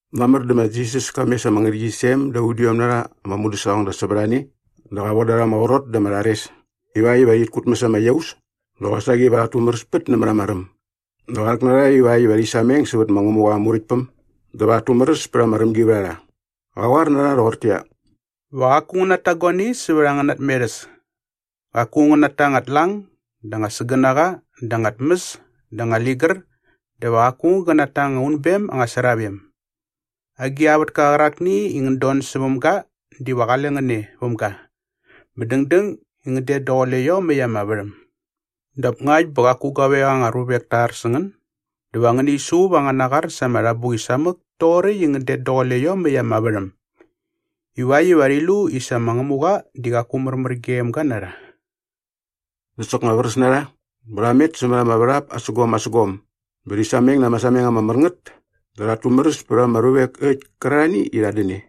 Mamär dä ma Jisas ka mes ama ngärhäqyisem da udiom na rha ama mudäsaqongda sävät a ne dä qa von da rha ama qrot dä ama rhares ivakt iva rhit kutmäs ama iaus dä qosaqi iva rhat tumäräspät nämät ama räm dä qa rhäk na rha ivakt iva rhi sameng sävät ma Ngämuqa aa Muräktpäm dä va rhat tumäräs pät ama rämgivärharha. Qä qoar na rha rhoqortäqyia, “Va qaku ngän nata guani sävät angäna tmerhäs. Qaku ngän nata anga tlang dä anga sägänaqa dä anga tmäs dä anga ligär dä va qaku aung gä nata anga unbem anga sravem. Agi a vätka qärakni i ngän don säväm ga diva qale ngän e väm ga bä dängdäng i ngän det daqule iomäkt ama värhäm. Dap ngakt bä qaku guavek anga ruvek ta ar sä ngän dä va ngäni suqup angäna qar sa ama rhabuqi samäk toqoräkt i ngän det daqule iomäkt ama värhäm ivakt iva rhi lu i sa ma Ngämuqa di qaku märmär gem ga na rha.” Dä soknga vräs na rha bä rha met sämät ama värhap asägom asägom bä rhi sameng na ama sameng ama mär ngät dä rhat tumäräspät ama ruvek äkt kärarhani i rhat dän e.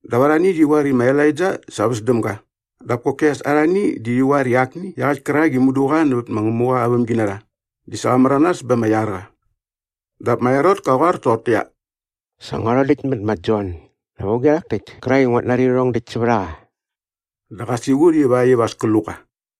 dap arhani rhi qoar i ma Elaija sa väs däm ga dap koki as arhani di rhi qoar i akni iaqäkt kärak i mudu qa nävät ma Ngämuqa aa vämginarha di sa qa märanas bä ama iar qa. Dap ma Herot ka qoar toqortäqyia, “Sa ngua rhodäkt mät ma Jon. Dap auge rhak täkt kärak i nguat nari rhärhong däkt sävät a qa?” Dä qa siqut ivakt iva as kä lu qa.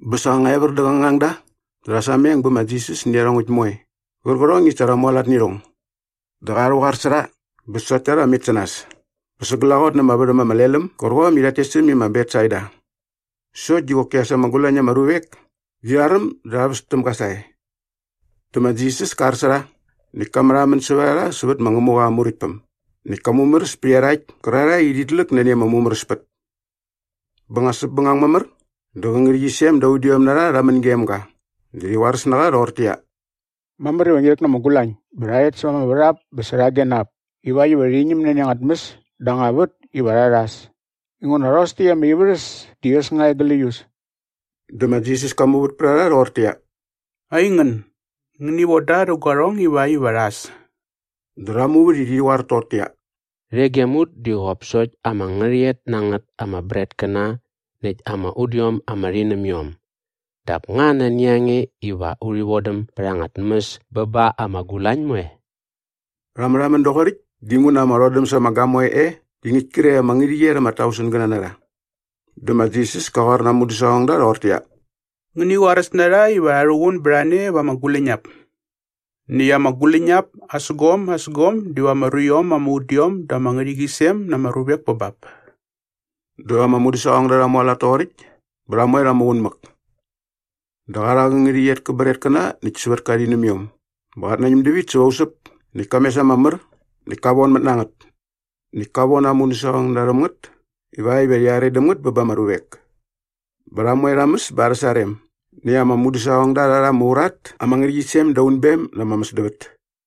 Bä sa nga evär dä qä ngangda dä rha sameng bä bä ma Jisas nä iarhongäkt moe qärqärhong i sa rha mualat nä irhong. Dä qa rhäqoar sä rha bä rhi na qa bä sokt ta rha met sä nas bä sa glaqot na ama värhäm ama lel äm gärqom i rhat tes äm i ma Betsaida, sokt di qoki as ama gulañ na ama ruvek di rha räm dä rha väs täm ga sae. Dä ma Jisas ka ar sä rha näkt ka märhamän sävät a rha sävät ma Ngämuqa aa Muräktpäm näkt ka mumäräs pät iarhakt kärarhae i rhit läk nani ama mumäräspät. Bä nga säpbängang mamär dä qä ngärhäqyisem da udiom na rha rha män gem ga dä rhi qoaräs na qa rhoqortäqyia, “Mamär iva ngi rhäk na ama gulañ bä va rha rhet sämät ama värhap bä särhage na ap ivakt iva rhi ñäm nani anga tmäs dä anga vät iva rha rhas inguna rhos täkt ama ivärhäs di äs nga e gläius.” Dä ma Jisas ka muvät pät a rha rhoqortäqyia, “Aingän, ngäni von da rhä guarhong ivakt iva rha äs.” Dä rha muvät i rhi qoar toqortäqyia, “Rhe gem ut di qop sokt ama ngärhäqyet na ngät ama bretkäna näkt ama udiom ama rhinämiom. Dap nga nani a nge iva urhi vodäm bät anga tmäs bä ba ama gulañ moe?” Rha märhamän doqoräkt dinguna ama rhodäm sa ama gamoe e di ngäkt kre ama ngärhäqyet ama tausengäna na rha. Dä ma Jisas ka qoar na aa mudäsaqongda rhoqortäqyia, “Ngäni qoaräs na rha iva rha rhuqun bät a ne va ama guläñap. Näkt ama guläñap asägom asägom diva ama ruiom ama udiom da ama ngärhäqyisem na ama ruvek pä bap.” Dä ama mudäsaqongda rha mualat toqoräkt bä rha moe rha muqun mäk. Dä qa rha qä ngärhäqyet kä bretkäna näkt sävät kä rhinämiom bä qat nañäm dävit säva usäp näkt ka mes ama mär näkt ka vonmät na ngät. Näkt ka von aa mudäsaqongda rhäm ngät ivakt iva rhi are däm ngät bä ba ama ruvek. Bä rha moe rha mäs bä arhä sarem näkt ama mudäsaqongda rha rha ama urat ama ngärhäqyisem da unbem na ama mäsdävät.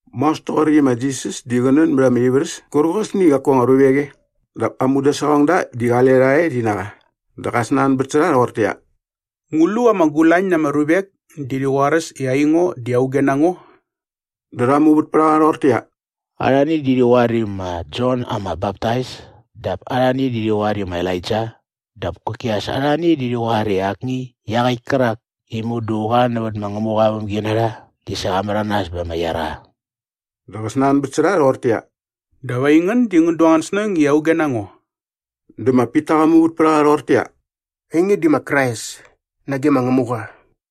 Maos toqoräkt i ma Jisas di qä nän bät ama ivärhäs kärqosni i qaku anga ruvek e dap aa mudäsaqongda di qale rha e rhi na qa dä qa snanbät sä rha rhoqortäqyia, “Ngu lu ama gulañ na ama ruvek di rhi qoaräs i aingo di auge na ngo?” Dä rha muvät pät a qa rhoqortäqyia, “Arhani di rhi qoar i ma Jon ama Baptais dap arhani di rhi qoar i ma Elaija dap koki as arhani di rhi qoar i akni iaqäkt kärak i mudu qa nävät ma Ngämuqa aa vämginarha di sa qa märanas bä ama iar qa.” Dä qä snanbät sä rha rhoqortäqyia, “Dap aingän di ngän du angän snäng i auge na ngo?” Dä ma Pita qa muvät pät a qa rhoqortäqyia, “Ainge di ma Krais nage ma Ngämuqa.”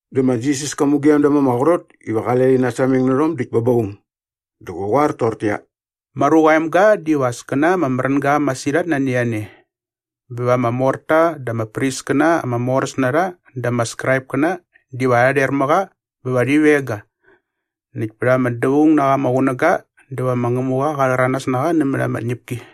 Dä ma Jisas ka mugem da ma ama qrot iva qale rhi nasameng nä rhom däkt bä ba aung. Dä qa qoar toqortäqyia, “Ma Ruqa aa Emga diva as kä na ama märänga masirhat nani a ne bä va ama morta dä ama priskäna ama moräs na rha dä ama Skraipkäna diva rha rher mä qa bä va rhi veng ga näkt pät ama dävaung na qa ama qunäga dä va ma Ngämuqa qa rhäranas na qa nämät ama tñäpki.”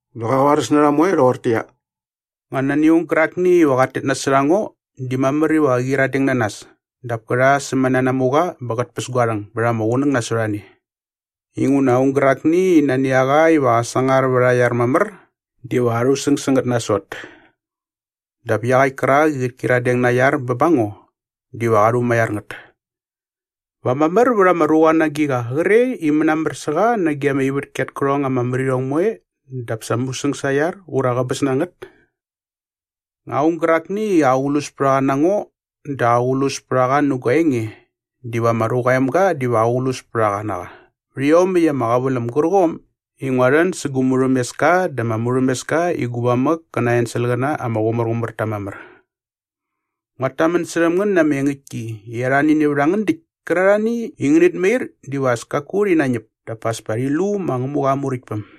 Dä qa qoaräs na rha moe rhoqortäqyia, “Nga nani aung gärakni iva qat tet nasot a ngo di mamär iva qä qyiradeng na nas dap kä rha aa sämänanamuqa bä qät päs gua rhäng bät ama qunäng nasot a ne. Inguna aung gärakni i nani a qa iva qä sangar vät aa iar mamär diva qa rhusäng sä ngät nasot. Dap iaqäkt kärak i qät kyiradeng na aa iar bä ba ngo diva qa rhumaiar ngät. Va mamär vät ama ruqa na agiqa qre i mänamär sä qa nage ama ivätki at kärhong ama mär irhong moe dap sa musäng sa aa iar ura käbäs na ngät? Nga aung gärakni i aqlus pät a qa na ngo dä aqlus pät a qa nä gua enge diva ma Ruqa aa Emga diva aqlus pät a qa na qa vät iomäkt ama qäväläm gärqom i ngua rhän sä gu murhämeska dä ama murhämeska i gu mamäk kä na aa enselqäna ama qumärqumär ta mamär. Nguat tamän särhäm ngän na ama engäktki i arhani nävät a ngän däkt kärarhani i ngänät mair diva as kaku rhi nañäp dap as pa rhi lu ma Ngämuqa aa Muräktpäm.”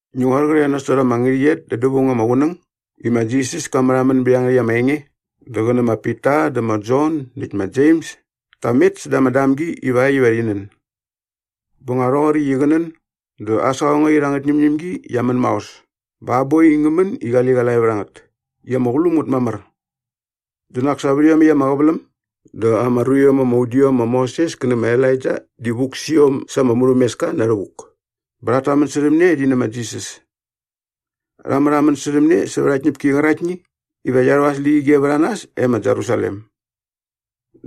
Ngi qoar qre nasot ama ngärhäqyet da dävaung ama qunäng i ma Jisas ka märhamän bät iangärhäkt ama enge dä qä nä ma Pita dä ma Jon näkt ma Jems ta met säda ama damgi ivakt iva rhi nän. Bä nga rhoqoräkt i qä nän dä aa saqongait angät ñämñämgi qia män maos bä aa boi di ngä män i qaliqalae vät a ngät i ama qulum ngät mamär. Dä nak sa vät iomäkt ama qäväläm dä ama ruiom ama udiom ma Moses kä nä ma Elaija di vuk sä iom sa ama murhämeska na rhävuk bä rhat tamän särhäm ne rhi nä ma Jisas. Rha märhamän särhäm ne sävät aa tñäpki qäraktni iva qia rhu at släqyige vät a nas e ma Jerusalem.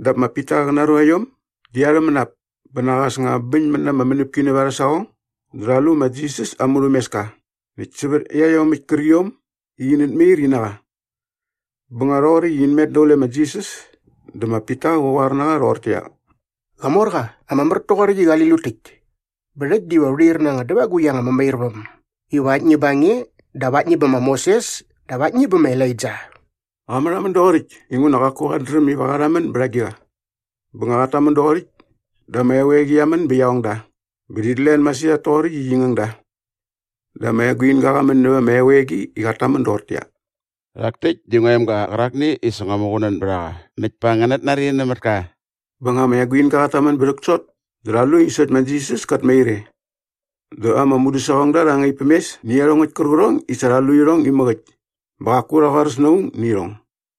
Dap ma Pita qä na aa ruaiom di arhä mänap bä nak as nga bäñmät na ama mänäpki nävät arhä saqong dä rha lu ma Jisas aa murhämeska näkt sävät iaiomäkt kärqiom i init mair in na qa. Bä nga rhoqoräkt i in met daqule ma Jisas dä ma Pita qa qoar na qa rhoqortäqyia, “Qamorqa, ama mär toqoräkt i qali lut täkt. Bä rhäkt diva u rhair na anga dävagukt anga mämairväm iva aktni bä nge dap aktni bä ma Moses dap aktni bä ma Elaija.” Qa märhamän doqoräkt inguna qaku qat dräm iva qa rhamän bät agiqa. Bä nga qat tamän doqoräkt dä ama eqoeqi qia män bä qia ong da bä rhit len masirhat toqoräkt i qi ngäng da. Dä ama eguinga qa män näva ama eqoeqi i qat tamän doqortäqyia, “Rhak täkt di ngua emga qärakni i sa ngua muqunän bät a qa näkt pa ngänät nari nämät ka.” Bä nga ama eguinga qat tamän bä rhäksot dä rha lu i sokt ma Jisas kat mair e. Dä ama mudäsaqongda rha ngaip päm mes nä iarhongäkt kärqärhong i sa rha lu irhong imäk äkt bä qaku rha qoaräs na aung nä irhong.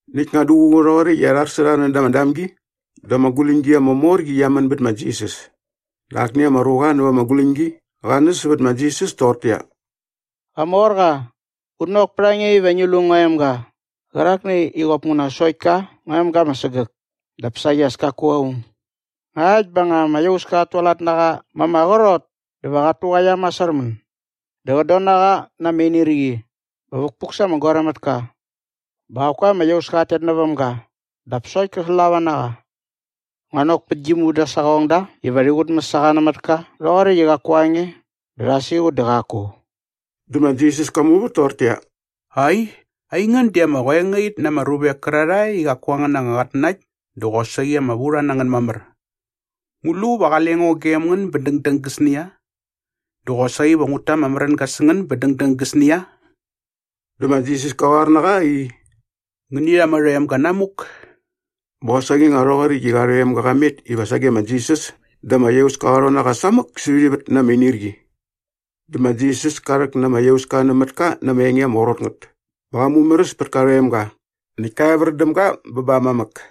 Näkt nga duququ rhoqoräkt i ar sä rha näda ama damgi dä ama guläñgi ama mor qi qia män bät ma Jisas. Dä akni ama ruqa näva ama guläñgi qa näs sävät ma Jisas toqortäqyia, “Qamorqa, ngut nok pät a nge iva ngi lu ngua emga qärakni i qop nguna sokt ka ngua emga ama sägäk dap saqi as kaku aung. Ngakt bä nga ama iauska qat tualat na qa ma ama qrot dä va qat tuqaia masärmän. Dä qät don na qa na ama inirqi bä vukpuk sa ama goaräm mät ka. Bä qaku ama iauska qat tet näväm ga dap sokt kä slava na qa. Ngua nok pät gi mudäsaqongda iva rhi qutmäs a qa nämät ka rhoqoräkt i qaku a nge dä rha siqut dä qaku.” Dä ma Jisas ka muvät toqortäqyia, “Ai, aingän di ama qoengait na ama ruvek kärarhae i qaku angän anga qatnanakt dä qosaqi ama vurha na ngän mamär. Ngu lu va qale ngo gem ngän bä dängdäng gäsnia? Dä qosaqi va ngut ta ama märänga sä ngän bä dängdäng gäsnia?” Dä ma Jisas ka qoar nä qa ruqa i, “Ngäni rha ama rhoemga namuk.” Bä qosaqi nga rhoqoräkt i qa rhoemga qa met iva sage ma Jisas dä ama iauska qa rhon na qa samäk sävät ivät na ama inirqi. Dä ma Jisas ka rhäk na ama iauska nämät ka na ama enge ama qrot ngät bä qa mumäräs pät ka rhoemga näkt ka evär däm ga bä ba aa mamäk.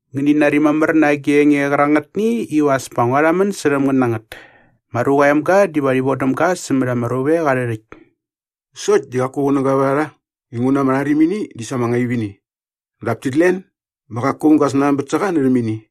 “Ngäni nari mamär na agi enge qärangätni iva as pa ngua rhamän särhäm ngän na ngät. Ma Ruqa aa Emga diva rhi vodäm ga sämät ama ruvek arhä rhäkt.” Sokt di qaku qunäga vät a rha inguna ama rharimini di sa ama ngaip ini. Dap tit len bä qaku aung ga snanbät sä qa närhäm ini.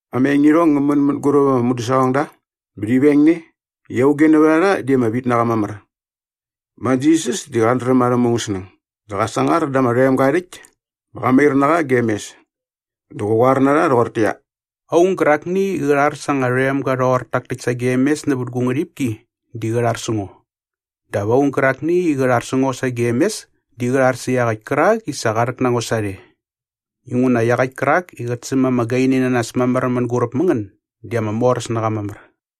Ama engirhong ngä män mänguräp ama mudäsaqongda bä rhi veng ne i auge nävät a rha di ama vit na qa mamär. Ma Jisas di qat dräm arhä mungäsnäng dä qa sangar da ama rhoemga aa rhäkt bä qa mair na qa gem mes. Dä qä qoar na rha rhoqortäqyia, “Aung gärakni i qä rhar sa anga rhoemga rhoqor tak täkt sagem mes nävät gu ngärhipki di qä rhar sä ngo. Dap aung gärakni i qä rhar sä ngo sagem mes di qä rhar sä iaqäkt kärak i sa qa rhäk na ngo sarhe. Inguna iaqäkt kärak i qät säm ama gaini na nas mamär mänguräp mä ngän di ama moräs na qa mamär.”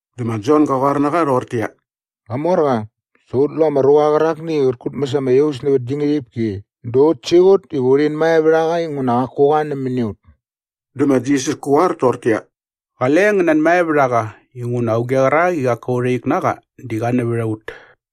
Dä ma Jon ga qoar na qa rhoqortäqyia, “Qamorqa, sa ut lu ama ruqa qärakni i qät kutmäs ama iaus nävät gi ngärhipki dä ut siqut iva urhin mae vät a qa inguna qaku qa nämäni ut.” Dä ma Jisas kä qoar toqortäqyia, “Qale ngän nanmae vät a qa inguna auge qärak i qaku a urha ik na qa di qa nävät a ut.”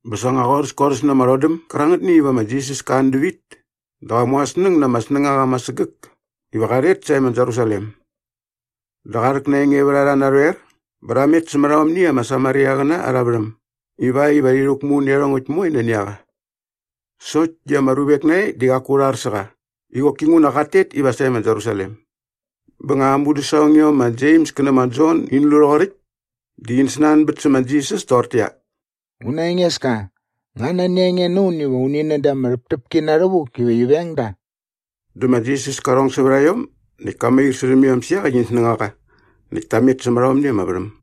Bä sa nga qorhäs korhäs na ama rhodäm gärangätni iva ma Jisas kä an dävit dä qa mu aa snäng na ama snängaqa ama sägäk iva qa rhet sae ma Jerusalem. Dä qa rhäk na aa engevärharha narhoer bä rha met sämät aomni ama Samariaqäna arha värhäm ivakt iva rhi rhäkmu nä iarhongäkt moe nani a qa sokt di ama ruvek nae di qaku rha ar sä qa i qoki nguna qat tet iva sae ma Jerusalem. Bä nga ama mudäsaqongiom ma Jems kä nä ma Jon in lu rhoqoräkt dä in snanbät sä ma Jisas toqortäqyia, “Una Engeska, nga nani a nge na un iva uni nän da ama rhäptäpki na rhävuk iva qi veng da?” Dä ma Jisas ka rhong sävät a iom näkt ka mair särhäm iom sä iaqäkt in snängaqa näkt ta met sämät aomni ama värhäm.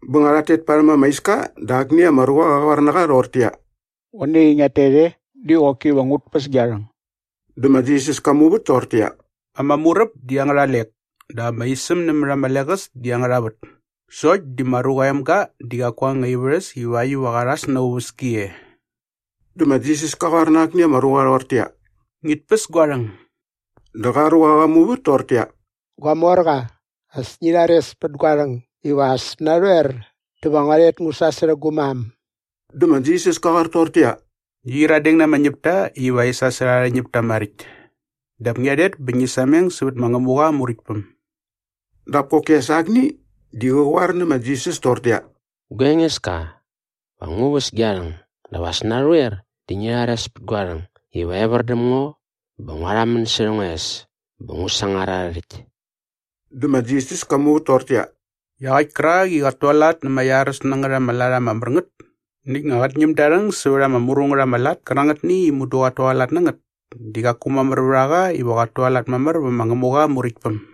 Bä nga rhat tet parhäm ama iska dä akni ama ruqa qa qoar na qa rhoqortäqyia, “Qoe nai i ngiat tet e di qoki va ngut päs gia rhäng.” Dä ma Jisas ka muvät toqortäqyia, “Ama muräp di angärha lek dap ama isäm nämät ama leqäs di angärha vät sokt di ma Ruqa aa Emga di qaku aa anga ivärhäs ivakt iva qa rhas na aa uväski e.” Dä ma Jisas ka qoar na akni ama ruqa rhoqortäqyia, “Ngit päs gua rhäng.” Dä qa ruqa qa muvät toqortäqyia, “Gua morqa, as ngi rhares pät gua rhäng iva as narhoer dä va ngua rhet ngu sasärhä gu mam.” Dä ma Jisas kä qoar toqortäqyia, “Ngi qyiradeng na ama ñäpta iva rhi sasärha arhä ñäpta maräkt dap ngia rhet bä ngi sameng sävät ma Ngämuqa aa Muräktpäm.” Dap koki as akni di qä qoar nä ma Jisas toqortäqyia, “Gua Engeska, va ngu väs gia rhäng dap as narhoer dä ngi rhares pät gua rhäng iva evär däm ngo bä ngua rhamän särha ngua es bä ngu sangar arhä rhäkt.” Dä ma Jisas ka muvät toqortäqyia, “Iaqäkt kärak i qat tualat na ama iaräs na ngät ama lat ama mär ngät näkt nga qät ñäm da aa rhäng sävät ama mru ngät ama lat kärangätni i mudu qat tualat na ngät di qaku mamär vät a qa iva qat tualat mamär vä ma Ngämuqa aa Muräktpäm.”